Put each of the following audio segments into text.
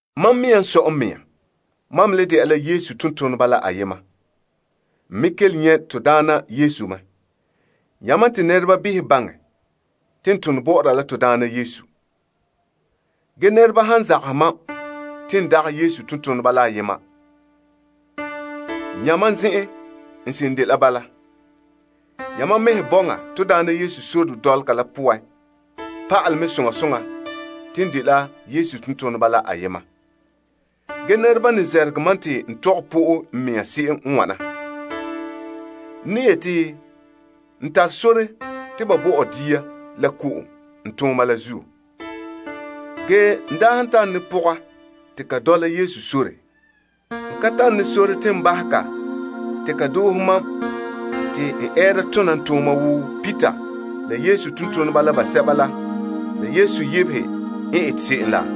Mam mea n sɔe n mea? Mam me le de'a la Yesu tontoneba la ayema? N me kelom nyɛ' to Daana Yesu mɛ? Yamam te nɛreba behɛ baŋɛ te n tone bɔ'ɔra la to Daana? Ge nɛreba han zagahɛ mam te n dagɛ Yesu tontoneba la yema, ya mam zen'en, n seren dela bala! Yamam mɛhe bɔŋa to Daana Yesu sore dɔlɔga la poan pa'alɛ mɛ soŋa soŋa te n dela Yesu tontoneba la ayema. Ge nɛreba n ne zɛrɛgɛ mam te n tɔgɛ pɔ'e n mea se'em n wana. To ka tare sore te ba bo tɔ dia la ko'om n tooma la zuo? Ge n daa han tare ne pɔga te ka dɔla Yesu sore, n ka tare ne sore te n bahɛ ka te ka doohe mam te n ɛɛra tona n tooma wo Kepas la Yesu tontoneba la basɛba la, la Yesu yebehe n ete se'em la?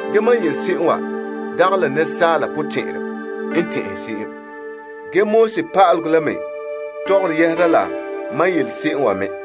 Mam n yele se'em wa nɛresaala potɛn'ɛrɛ n tɛn'ɛhere se'em? Pa'alegɔ la me tɔgɔre yɛhera la mam n yele se'em wa me nɔɔ?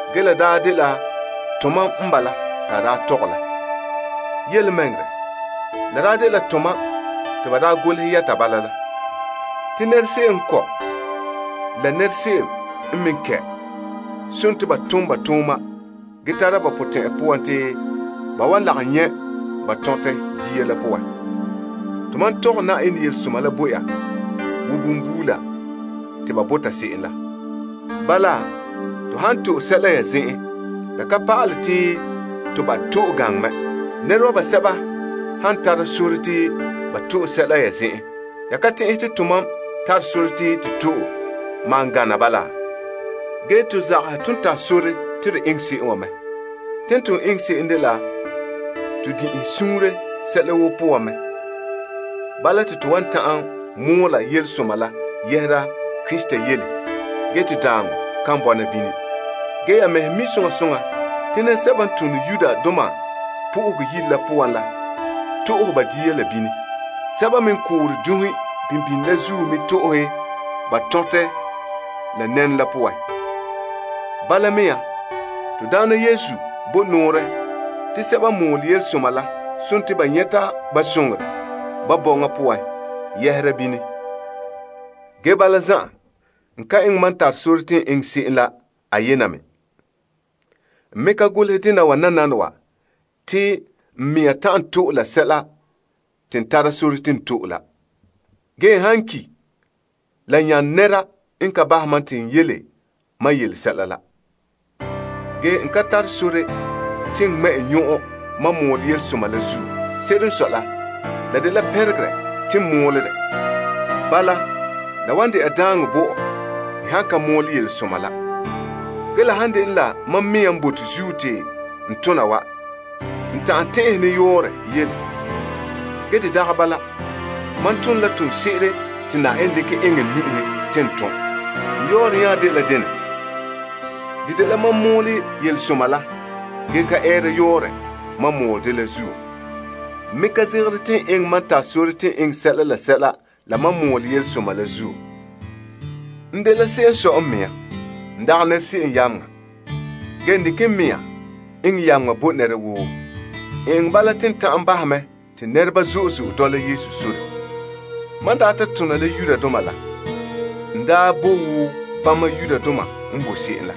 Ge la daa dela tomam n bala te a daa tɔgɛ la. Yelemɛŋɛrɛ, la daa dela tomam te ba daa golehɛ yɛta bala la. Te nɛra se'em n kɔ' la la nɛra se'em n me kɛ' sontii ba tom ba tooma gee tara ba potɛn'ya poan te ba wan lagom nyɛ' ba tɔntɛ dia la poan. Tomam tɔgɛ Yenɛ yelesoma la bo ya wo bonbuula te ba bota se'em la. Bala, to han to'e sɛla ya zen'en, la ka pa'alɛ te to ba' to'e gaŋɛ mɛ? Nɛreba basɛba han tara sore te ba to'e sɛla ya zen'en, ya ka tɛn'ɛhe to tomam tare sore te to'e, ge maan gana bala? To zagahɛ ton tare sore te to eŋɛ se'em wa mɛ. Te ton eŋɛ sɛla woo te to wan ta'an mɔɔla yelesoma la yɛhera Krista yele ge te daaŋɔ kan bɔna bini. Ya mɛhe mi' soŋa soŋa te nɛresɛba n tone Yenɛ Yire la poan la to'ohe ba dia la bini. Sɛba me n koore dunhe kaanbegɔ daka la zuo la me to'ohe ba tɔntɛ la nɛnɔ la poan. Bala mea nɔɔ, to Daana bo nɔɔrɛ te sɛba n mɔɔlɛ yelesoma la sontii ba nyɛta ba soŋorɛ ba bɔŋa poan yɛhera bini. Ge bala zan'an, n ka eŋɛ mam tare sore te n eŋɛ se'em la ayena me. N me ka golehɛ dena wa nananawa te n mea ta'an to'e la sɛla te n tare sore te n to'e la. N bote te n han ki' la nyane nɛra n ka bahɛ mam te n yele mam yele sɛla la. N ka tare sore te n ŋmɛ' n nyɔn'ɔn mam mɔɔlɛ yelesoma la zuo. Se'ere n sɔe la, la dela pɛnregerɛ te n mɔɔlɛ dɛ. Bala, la wan de'a daaŋɔ zo'e zo'e bɔ'ɔ n han ka mɔɔlɛ yelesoma la! La han dene la mam mea n bote zuo te n tona wa, n ta'an tɛn'ɛhe ne yɔɔrɔ yele. Mam tone la toonse'ere te Yenɛ dekɛ eŋɛ n nu'uhe te n tom. N yɔɔrɛ nya ye dela dene? De dela mam mɔɔle yelesoma la gee ka ɛɛra yɔɔrɛ mam mɔɔlɛ dɛ la zuo. N me ka zegere te n eŋɛ mam tare sore te n eŋɛ sɛla la sɛla la mam mɔɔle yelesoma la zuo. N dela se'em n sɔe n mea. N dagɛ nɛra se'em yameŋa, ge n dekɛ n mea eŋɛ yameŋa bo nɛra woo. N eŋɛ bala te n ta'an bahɛ mɛ te nɛreba zo'e zo'e dɔla Yesu sore. Mam daa ta tona la Yudoma la, n daa bo wo bama Yudoma n bo se'em la.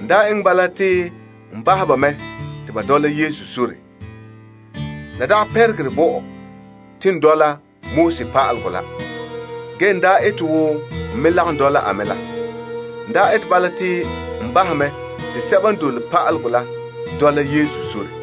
N daa eŋɛ bala te n bahɛ ba mɛ te ba dɔla Yesu sore. La dagɛ pɛnregerɛ bo ɔ te n dɔla pa'alegɔ la ge n daa ete wo n me lagom dɔla a me la te sɛba n dole pa'alegɔ la me dɔla Yesu sore.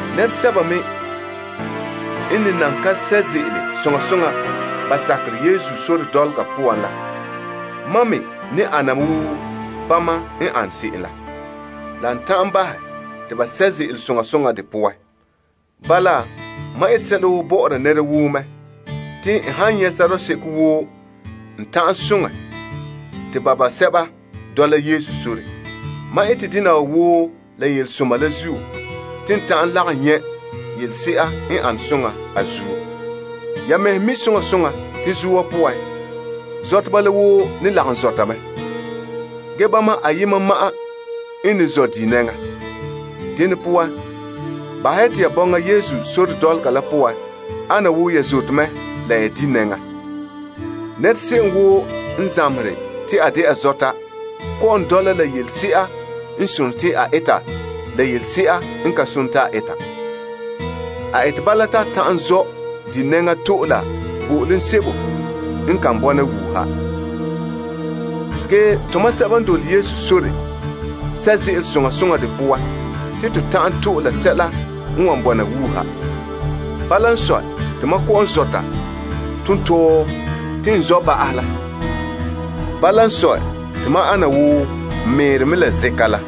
Nɛresɛba me n ne nan ka sɛ' ze'ele soŋa soŋa ba sakerɛ Yesu sore dɔlɔga poan la, ma me ne ana wo bama n an se'em la, la n ta'an bahɛ te ba sɛ' ze'ele soŋa soŋa de poan. Bala, mam ete sɛla woo bɔ'ɔra nɛra woo mɛ te n han nyɛ' sɔrɔɔ seko woo n ta'an soŋɛ te ba basɛba dɔla Yesu sore. Mam ete dena wa woo la yelesoma la zuo te n ta'an lagom nyɛ' yelese'a n an soŋa a zuo. Yamehe mi' soŋa soŋa te zoa poan, zɔteba la woo ne lagom zɔta mɛ. Ge, bama ayema ma'an n ne zɔ' di' nɛŋa. Dene poan, bahɛ ya te ya bɔŋa Yesu sore dɔlɔga la poan ana wo ya zote mɛ, la ya di' nɛŋa. Nɛra se'em woo n zamehere te a de'a zɔta kɔ'ɔn dɔla la yelese'a n sone te a eta la yelese'a n ka sone te a eta. A ete bala te a ta'an zɔ' di' nɛŋa to'e la bo'olom sebo n kan bɔna wuuha. Ge, tomam sɛba n dole Yesu sore sɛ' ze'ele soŋa soŋa de poan te to ta'an to'e la sɛla n wan bɔna wuuha. Bala n sɔe, te mam kɔ'ɔn zɔta tontɔɔ te n zɔ' ba'ahɛ la. Bala n sɔe, te mam ana wo n meere la zɛnkan la.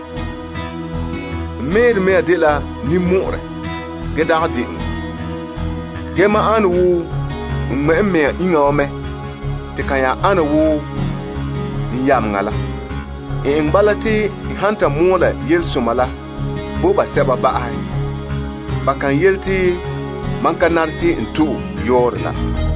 N meere mea dela ninmɔ'ɔrɛ gee dagɛ de'eŋɔ. Ge mam ane wo n ŋmɛ' n mea iŋa wa mɛ te ka nya ana wo n yameŋa la. N eŋɛ bala te n han ta mɔɔlɛ yelesoma la bo basɛba ba'ahɛ, ba kan yele te mam ka nare te n to'e yɔɔrɛ la.